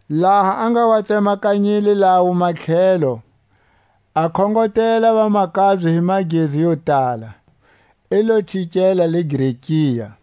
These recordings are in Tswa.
Laha a nga wa tsemakanyile lawo matlhelo, a khongotela vamakabye hi magezu yo tala, i lo chikela le Grekia.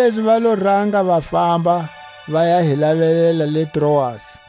Kanilezi va lo ranga va famba, va ya hi lavelela le Troasi.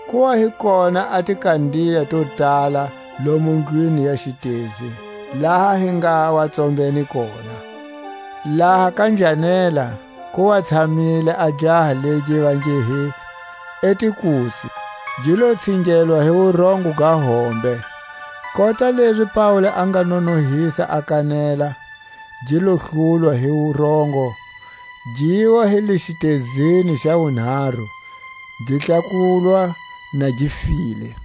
Ku wa hi kona a tikandiya to tala lomu ndlwini ya xitezi, laha hi nga wa tsombene kona. Laha ka njhanela ku wa tshamile a jaha legi va nge hi Etikusi, gi lo tsingelwa hi wurongo ga hombe. Kota lezi Paule a nga nonohisa a kanela, gi lo hlulwa hi wurongo, giwa hi le xitezini xa wunharu, gi tlakulwa na gi file.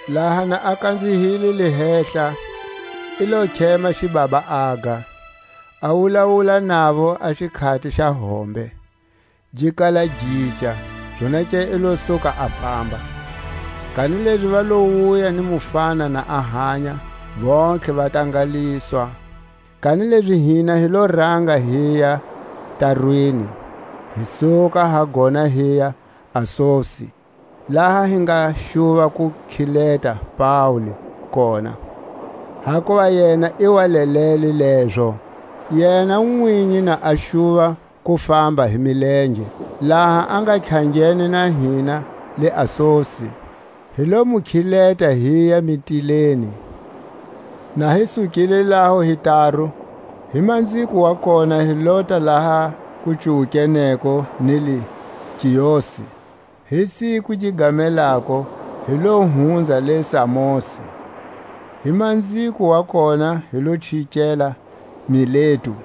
Laha na a kanzihile le hehla, i lo khema xibaba, aga, a wulawula navo a xikhati xa hombe, gi kala gica, zonake i lo suka a famba. Kanilezi va lo wuya ni mufana na a hanya, vontlhe va tangaliswa. Kanilezi hina hi lo ranga hiya tarwini, hi suka ha gona hiya Asosi, laha hi nga xuva ku khileta Paule kona, hakuva yena i wa lelele lezo, yena nwinyi na a xuva ku famba hi milenge. Laha a nga tlhangene na hina le Asosi, hi lo mu khileta, hiya Mitilene. Na hi sukile laho hi taru, hi manziko wa kona hi lota laha ku cuwukeneko ni le Kiosi. Hi siku gi gamelako hi lo hunza le Samosi; hi manziko wa kona hi lo chikela Miletu.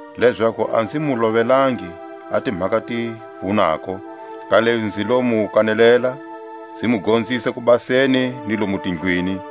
lezaku a nzi mu lovelangi a timhaka ti vunako, kanilezi nzi lo mu kanelela, nzi mu gonzisa kubaseni ni lomu tindlwini,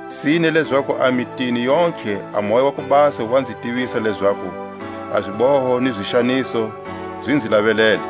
Sine lezaku a mitini yontlhe a Moya wa ku Basa wa nzi tivisa lezaku a ziboho ni zixaniso zi nzi lavelele.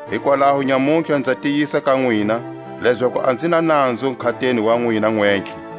Hikwalaho nyamutlha nza tiyisa ka nwina, lezaku a nzi na nanzu nkhateni wa nwina nwentlhe.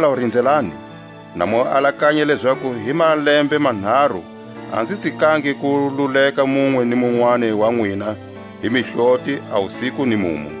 Hikwalaho rinzelani, na mu alakanya lezaku hi malembe manharu a nzi tsikangi ku luleka munwe ni munwani wa nwina hi mihloti a wusiku ni mumu.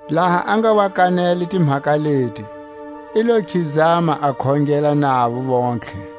Laha a nga wa kanele timhaka leti, i lo khizama a khongela navo vontlhe.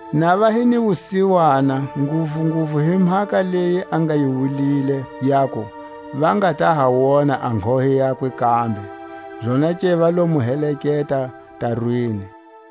Na va hi ni wusiwana nguvunguvu hi mhaka leyi a nga yi wulile, yaku: Va nga ta ha wona a nghohe yakwe kambe. Zonake va lo mu heleketa tarwini.